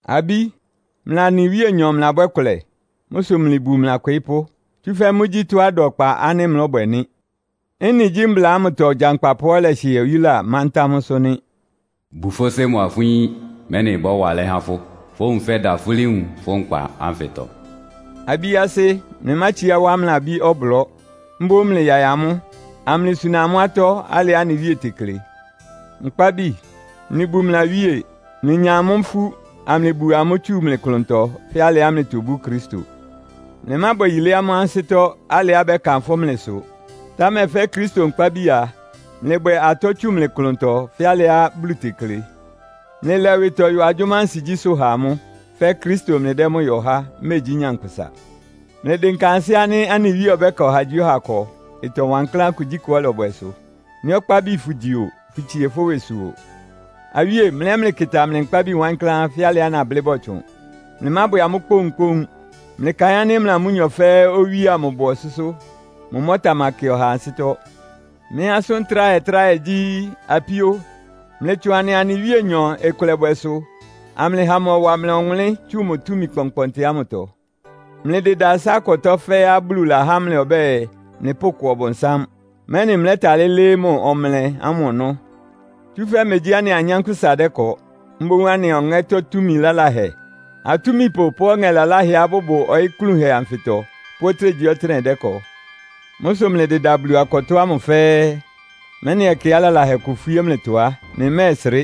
Abí, mlɩa anɩ Wíenyɔ mlɩlabwɛ́ kʋlɛ. Mʋ́ sʋ mlɩbu mlɩ akwɩɩ́pʋ́. Tsúfɛ́ mʋ́gyí tɔ́á ɩda ɔkpa ánɩ́ mlɔ́bwɛ nɩ́. Ɩ́nɩ gyí mbla ámʋtɔ gyankpapʋá ɔlɛhɩɛ oyúla mántá mʋ́sʋ́ nɩ́. “Bu fʋ́ sɩ́ mʋ́a fʋ́ yín, mɛ́nɩ ɩbɔ́wa alɛ́ há fʋ́. Fówun fɛ́dan fulí nwun fʋ́ nkpa ánfɩtɔ.” Abí asɩ́, mlɩmátsiá wá mlɩ abí ɔblɔ́. Mboún mlɩyaɩ amʋ́, amlɩsuna amʋ́ atɔ́ alɩá anɩ Wíe tekle. Nkpábi, mlɩbu mlɩ awíe. Mlɩnya amʋ́ ifú, amlɩbu amʋ́ tsu mlɩ klʋntɔ fɛ́ alɩá mlɩtobú Kristo. Mlɩmábwɛ yilé amʋ́ ansɩ́tɔ́ alɩá bɛ́kanfʋ́ mlɩ sʋ. Támɛ fɛ́ Kristo nkpábi a, mlɩbwɛ atɔ́ tsu mlɩ klʋntɔ fɛ́ alɩá Bulu tekle. Mlɩlɛ ɩwɩtɔ yɔ agyʋ́má ansigyísʋ́ ha amʋ́, fɛ́ Kristo mlɩdɛ́ mʋ́ yɔ há, megyí nyankpʋsa. Mlɩdɩnka ansɩ́ ánɩ́ anɩ Wíe ɔbɛ́ka ɔhagyíɔha ɩkɔ, ɩtɔ wankláán kugyíkʋá ɔlɔbwɛ sʋ. Nɩ́ ɔkpábi fʋgyi o, fʋtsie fʋ́ ɩwɩsʋ o. Awíé, mlɩ ɛ́ mlɩkɩta mlɩ nkpábi wankláán, fɛ́ alɩá nablɩ́ bɔtsʋn. Mlɩmábwɛ amʋ́ kpóunkpóun. Mlɩkaɩn ánɩ́ mlɩa amʋ́nyɔ fɛ́ɛ́ owíe ámʋ bʋ ɔsʋ́sʋ́. Mʋ mʋ́ ɔtamakɩ ɔhaa ansɩ́tɔ́. Mɩ́ asʋ́n tráhɛ-tráhɛ gyí, apíó, mlɩtsʋn anɩa anɩ Wíenyɔ ɩkʋlɛbwɛsʋ amlɩha mʋ ɔwa mlɩ ɔwʋnlɩ́n tsu mʋ túmi kpɔnkpɔntɩ ámʋtɔ. Mlɩdɩda ɩsá-akɔtɔ́ fɛ́ɛ́á Bulu lahá mlɩ ɔbɛ́ɛ, mlɩpʋ́kɔ Ɔbʋnsám, mɛ́nɩ mlɛ́talɩ́ lɩ́ɩ́ mʋ ɔmlɛ ámʋ ɔnɔ́. Tsúfɛ́ megyí anɩa anyánkpʋ́sa dɛ́kɔ. Mboún anɩa ɔŋɛ́tɔ́ túmi laláhɛ, atúmipʋ pʋ́ ɔŋɛ laláhɛá bʋbʋ ɔyɩ́ klúnhɛ anfɩtɔ pʋ́ ɔtɩ́nɛgyíɔtɩ́nɛ́ dɛ́kɔ. Mʋ́ sʋ mlɩdɩda Bulu akɔtɔ́ ámʋ fɛ́ɛ́, mɛ́nɩ ɛkɛá lalahɛ kʋ ifwíé mlɩtɔ á, mlɩmɛ́ɛsrɩ́,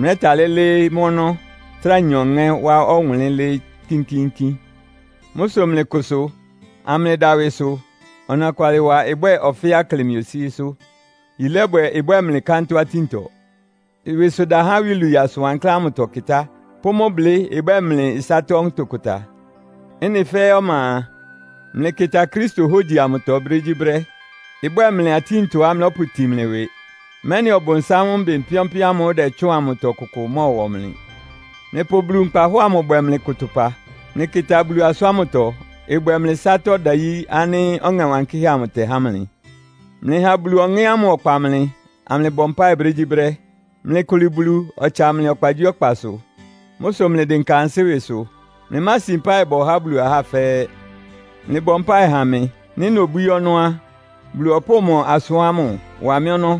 mlɛ́talɩ́ lɩ́ɩ́ mʋ́ ɔnɔ́, trá nya ɔŋɛ́ wá ɔwʋnlɩ́n lɩ́ɩ́ kínkíínkín. Mʋ́ sʋ mlɩkʋsʋ, amlɩda ɩwɩsʋ. Ɔnɔkwalɩwa ɩbwɛ́ɛ ɔfɛ́á ɩklɩ mlɩ osíésʋ́. Yilébwɛ ɩbwɛ mlɩ kántɔ́-atíntɔ. Ɩwɩsʋda há iwilwii asʋn wankláán ámʋtɔ kɩtá pʋ́ mʋ́ blɩ́ ɩbwɛ́ɛ mlɩ ɩsátɔ́ ntʋkʋta. Ɩ́nɩ fɛ́ɛ́ ɔma a, mlɩkɩta Kristo hógyi amʋtɔ brégyíbrɛ́. Ɩbwɛ́ɛ mlɩ atíntɔá mlɔ́pʋtin mlɩ ɩwɩ, mɛ́nɩ Ɔbʋnsám mbɩn pɩ́ɔ́npɩ́ɔ́n ámʋ́ʋ́ ɩdɛtsʋ́ʋn amʋtɔ kʋkʋ ɩmɔ́ɔwɔ mlɩ. Mlɩpʋ Bulu nkpahɔ́ɔ amʋ bwɛ mlɩ kʋtʋpa. Mlɩkɩta Bulu asʋ́n ámʋtɔ, ɩbwɛ mlɩ ɩsátɔ́ ɔdayí ánɩ́ Ɔŋɛ Wankɩ́hɛ́ amʋ tɛhá mlɩ. Mlɩha Bulu Ɔŋɛ́ ámʋ ɔkpa mlɩ, amlɩbɔ mpáɩ brégyíbrɛ́. Mlɩkʋlɩ Bulu, ɔtsa mlɩ ɔkpagyíɔkpasʋ. Mʋ́ sʋ mlɩdɩnka ansɩ́ ɩwɩsʋ. Mlɩmási mpáɩ bɔ há Bulu ahá fɛ́ɛ́. Mlɩbɔ mpáɩ ha mɩ. Nɩ́ nobwíí ɔnɔ́ á, Bulu ɔpʋ́ʋ mʋ asʋ́n ámʋ wa mɩ́ ɔnɔ́;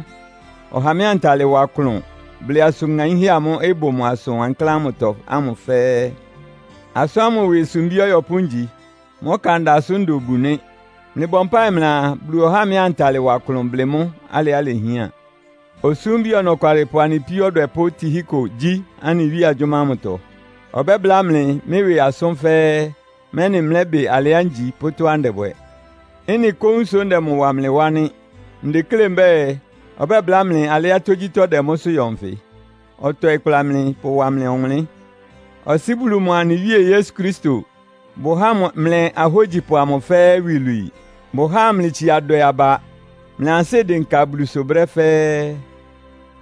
ɔha mɩ́ antalɩ wa klʋn blɩ asʋn ŋaínhɛ́ amʋ́ʋ́ ɩbʋ mʋ asʋn wankláán ámʋtɔ ámʋ fɛ́ɛ́. Asʋ́n ámʋ ɩwɩ sumbí ɔyɔpʋ́ ngyi. Mʋ́ ɔkanda sʋ́ nda obu nɩ́. Mlɩbɔ mpáɩ mlɩaa, Bulu ɔhá mɩ́ antalɩ wa klʋn blɩ mʋ́ alɩá ilehián. Osúmbi ɔnɔkwalɩpʋ anɩ píó ɔdwɛpʋ́ Tihiko gyí anɩ Wíe agyʋ́má ámʋtɔ. Ɔbɛ́bláa mlɩ mɩ́ ɩwɩ asʋ́n fɛ́ɛ́, mɛ́nɩ mlɛ́bɩ alɩá ngyi pʋ́ tɔ́á ndɛbwɛ. Ɩ́nɩ kóún sʋ ndɛ mʋ wa mlɩ wá nɩ́. Ndeklé mbɛ́ɛ, ɔbɛbláa mlɩ alɩá tógyítɔ́ ɩdɛ mʋ́sʋ́ yɔ nfɩ. Ɔtɔɩ kpla mlɩ pʋwa mlɩ ɔwʋnlɩ́n. Ɔsɩ́ Bulu mʋa anɩ Wíe Yesu Kristo bʋháa mlɩ ahógyipʋ amʋ fɛ́ɛ́ iwilwii. Bʋháa amlɩtsia dwɛ aba, mlɩ ansɩ́ ɩdɩnka Bulusʋ brɛ́ fɛ́ɛ́.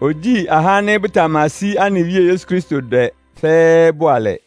Ogyíi ahá ánɩ́ bʋtamasí anɩ Wíe Yesu Kristo dwɛ fɛ́ɛ́ bʋalɛ.